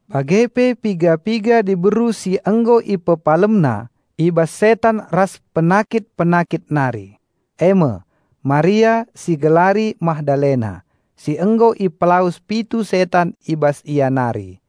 bage pe piga-piga diberu si nggo IpepalemNa i bas setan ras penakit-penakit nari, e me: Maria (si igelari Magdalena) si nggo ipelawes pitu setan i bas ia nari;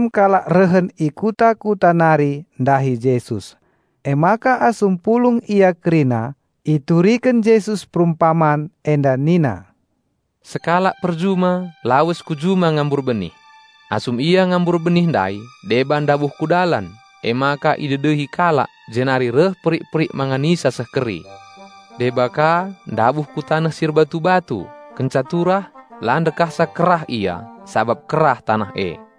Nterem kalak rehen i kuta-kuta nari ndahi Jesus, emaka asum pulung ia kerina ituriken Jesus perumpaman enda nina, "Sekalak perjuma lawes ku juma ngambur benih. Asum ia ngambur benih ndai, deba ndabuh ku dalan, emaka idedehi kalak jenari reh perik-perik manganisa seh keri. Deba ka ndabuh ku taneh si erbatu-batu, kenca turah, la ndekahsa kerah ia, sabap kerah taneh e.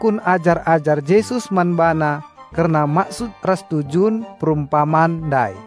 Emaka nungkun ajar-ajar Jesus man BaNa kerna maksud ras tujun perumpaman ndai.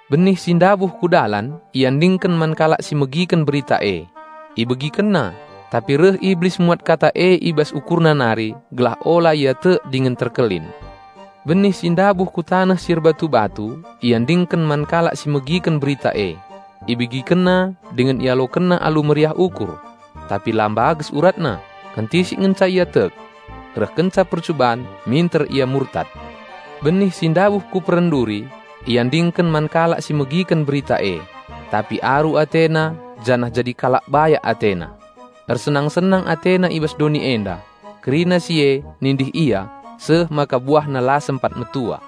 Benih si ndabuh ku dalan iandingken man kalak si megiken berita e, ibegikenna, tapi reh Iblis muat kata e i bas ukurna nari gelah ula ia tek dingen terkelin. Benih si ndabuh ku taneh si erbatu-batu iandingken man kalak si megiken berita e, ibegikenna dingen ialokenna alu meriah ukur. Tapi la mbages uratna, kentisik ngenca ia tek. Reh kenca percuban minter ia murtad. Benih si ndabuh ku peren duri, iandingken man kalak si megiken berita e, tapi aru atena janah jadi kalak bayak atena. Ersenang-senang atena i bas doni enda. Kerina si e nindih ia seh maka buahna la sempat metua.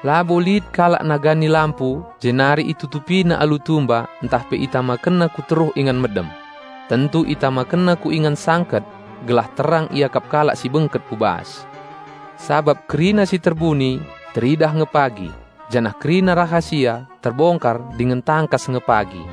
"Labo lit kalak nagani lampu jenari itutupina alu tumba ntah pe itamakenna ku teruh ingan medem. Tentu itamakenna ku ingan sangket gelah terang iakap kalak si bengket ku bas. Sabap kerina si terbuni teridah nge pagi janah kerina rahasia terbongkar dingen tangkas nge pagi.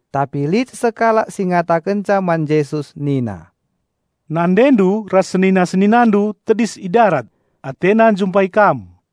Tapi lit sekalak si ngatakenca man Jesus Nina "NandeNdu ras senina-SeninaNdu tedis i darat, atena njumpai Kam."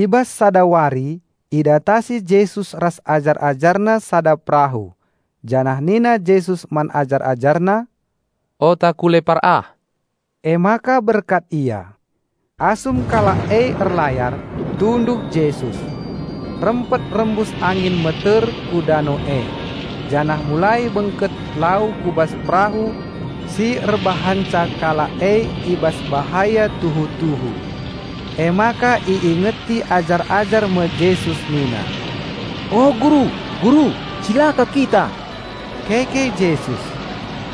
I bas sada wari idatasi Jesus ras ajar-AjarNa sada perahu, janah nina Jesus man ajar-AjarNa, "Ota ku lepar ah." Emaka berkat ia. Asum kalak e erlayar, tunduh Jesus. Rempet rembus angin meter ku dano e, janah mulai bengket lau ku bas perahu si erbahanca kalak e i bas bahaya tuhu-tuhu. Emaka iingeti ajar-ajar me Jesus nina, "O Guru, Guru! Cilaka kita!" Keke Jesus,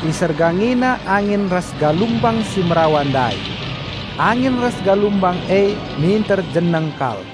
IsergangiNa angin ras galumbang si merawa ndai. Angin ras galumbang e minter jeneng kal.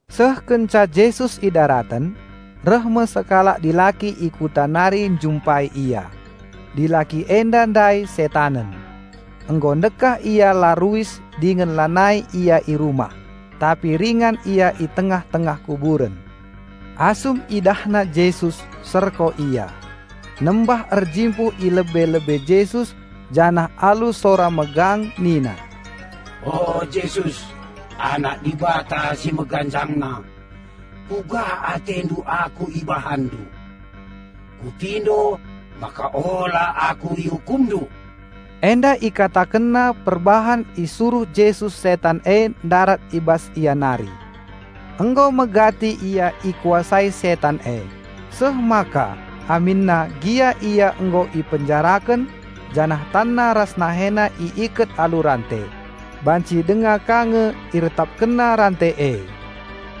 Seh kenca Jesus idaraten, reh me sekalak dilaki i kuta nari njumpai Ia. Dilaki enda ndai setanen. Nggo ndekah ia la ruis dingen lanai ia i rumah, tapi ringan ia i tengah-tengah kuburen. Asum idahna Jesus serko ia, nembah-erjimpuh i lebe-lebe Jesus janah alu sora megang nina, "O Jesus, Anak Dibata si Meganjangna, kuga AteNdu aku IbahanNdu? Kupindo maka Ola aku IukumNdu!" Enda ikatakenna perbahan isuruh Jesus setan e ndarat i bas ia nari. Nggo megati ia ikuasai setan e, seh maka aminna gia ia nggo ipenjaraken janah tanna ras nahena iiket alu rante, banci denga ka nge iretapkenna rante e,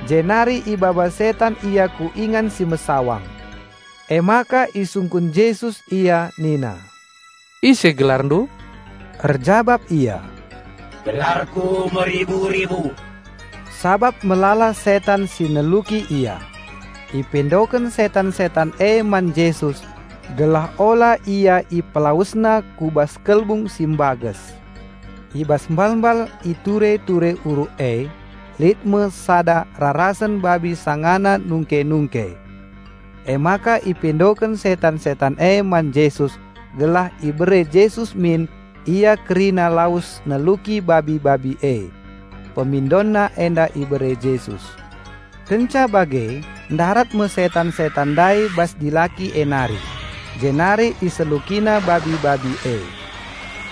jenari ibaba setan ia ku ingan si mesawang. Emaka isungkun Jesus ia nina, "Ise gelarndu?" Erjabap ia, "Gelarku Meribu-ribu," sabap melala setan si neluki ia. Ipindoken setan-setan e man Jesus gelah Ola ia IpelawesNa ku bas kelbung si mbages. I bas mbal-mbal i ture-ture uruk e, lit me sada rarasen babi sangana nungke-nungke. Emaka ipindoken setan-setan e man Jesus gelah ibere Jesus min ia kerina lawes neluki babi-babi e. Pemindonna enda ibere Jesus. Kenca bage, ndarat me setan-setan ndai bas dilaki e nari, jenari iselukina babi-babi e.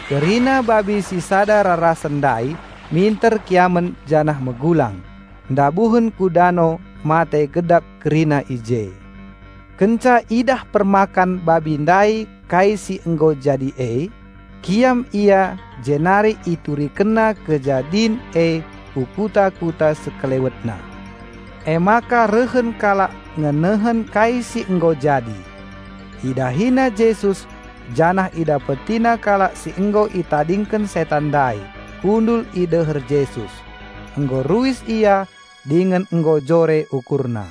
Kerina babi si sada rarasen ndai minter kiamen janah megulang, ndabuhen ku dano mate gedap kerina i je. Kenca idah permakan babi ndai kai si nggo jadi e, kiam ia jenari iturikenna kejadin e ku kuta-kuta sekelewetna. Emaka rehen kalak ngenehen kai si nggo jadi. Idahina Jesus janah idapetina kalak si nggo itadingken setan ndai kundul i deher Jesus; nggo ruis ia dingen nggo jore ukurna.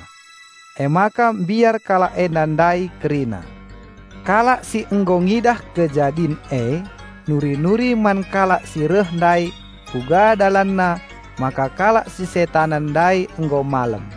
Emaka mbiar kalak enda ndai kerina. Kalak si nggo ngidah kejadin e, nuri-nuri man kalak si reh ndai kuga dalanna maka kalak si setanen ndai nggo malem.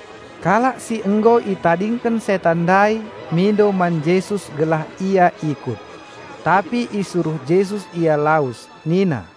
Kalak si nggo itadingken setan ndai mindo man Jesus gelah ia ikut. Tapi isuruh Jesus ia lawes nina,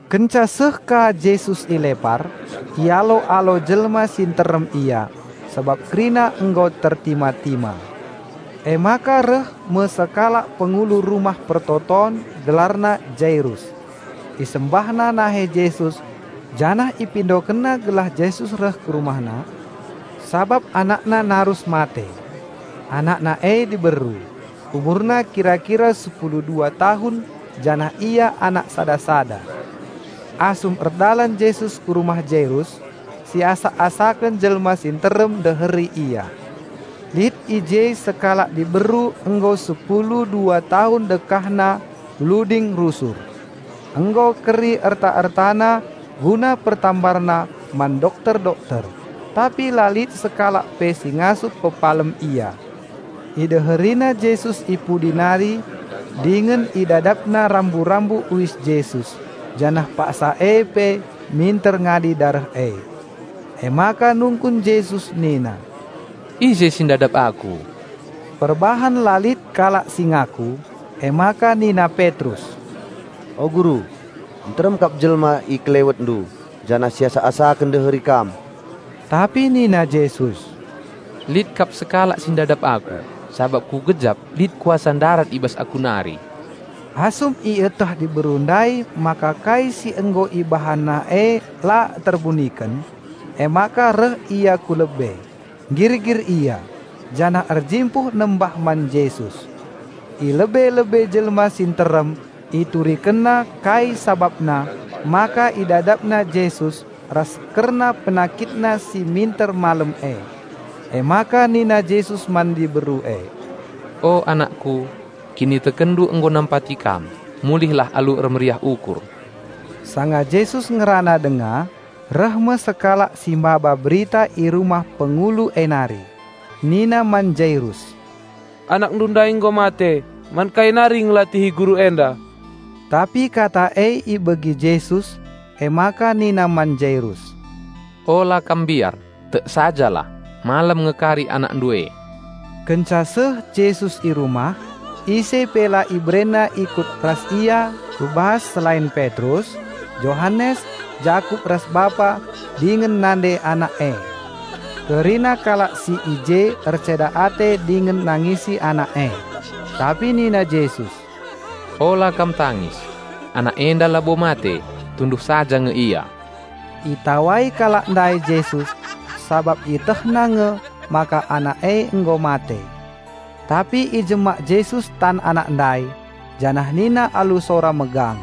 Kenca seh ka Jesus i lepar, ialo-alo jelma si nterem Ia, sabap kerina nggo tertima-tima. Emaka reh me sekalak pengulu rumah persembahen gelarna Jairus. Isembahna nahe Jesus janah ipindokenna gelah Jesus reh ku rumahna, sabap anakna narus mate. Anakna e diberu, umurna kira-kira sepulu dua tahun janah ia anak sada-sada. Asum erdalan Jesus ku rumah Jairus, siasak-asaken jelma si nterem ndeheri Ia. Lit i je sekalak diberu nggo sepulu dua tahun dekahna bluding rusur. Nggo keri erta-ertana guna pertambarna man dokter-dokter, tapi la lit sekalak pe si ngasup pepalem ia. Ideherina Jesus i pudi nari dingen idadapna rambu-rambu uis Jesus, janah paksa e pe minter ngadi dareh e. Emaka nungkun Jesus nina, "Ise si ndadap Aku?" Perbahan la lit kalak si ngaku, emaka nina Petrus, "O Guru, nterem kap jelma i KelewetNdu janah siasak-asaken ndeheri Kam." Tapi nina Jesus, "Lit kap sekalak si ndadap Aku, sabap Kugejap lit kuasa ndarat i bas Aku nari." Asum ieteh diberu ndai maka kai si nggo ibahanna e la terbuniken, emaka reh ia ku lebe, nggirgir ia, janah erjimpuh nembah man Jesus. I lebe-lebe jelma si nterem iturikenna kai sabapna maka idadapna Jesus ras kerna penakitna si minter malem e. Emaka nina Jesus man diberu e, "O anakKu, kinitekenndu nggo nampati kam, mulihlah alu ermeriah ukur." Sanga Jesus ngerana denga, reh me sekalak si mbaba berita i rumah pengulu e nari. Nina man Jairus, "Anakndu ndai nggo mate, man kai nari ngelatihi Guru enda?" Tapi kata e ibegi Jesus, emaka nina man Jairus, "Ola kam mbiar, tek sajalah, malem nge kari anakndu e." Kenca seh Jesus i rumah, ise pe la iberena ikut ras ia ku bas selain Petrus, Johanes, Jakup ras bapa dingen nande anak e. Kerina kalak si i je erceda ate dingen nangisi anak e. Tapi nina Jesus, "Ola kam tangis; anak enda labo mate, tunduh saja nge ia!" Itawai kalak ndai Jesus, sabap ietehna nge maka anak e nggo mate. Tapi ijemak Jesus tan anak ndai, janah nina alu sora megang,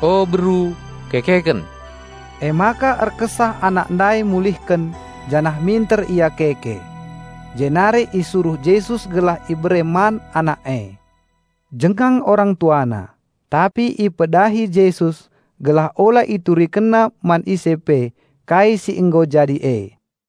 "O beru, kekeken!" Emaka erkesah anak ndai mulihken janah minter ia keke. Jenari isuruh Jesus gelah ibere man anak e. Jengang orang tuana, tapi ipedahi Jesus gelah ula iturikenna man ise pe kai si nggo jadi e.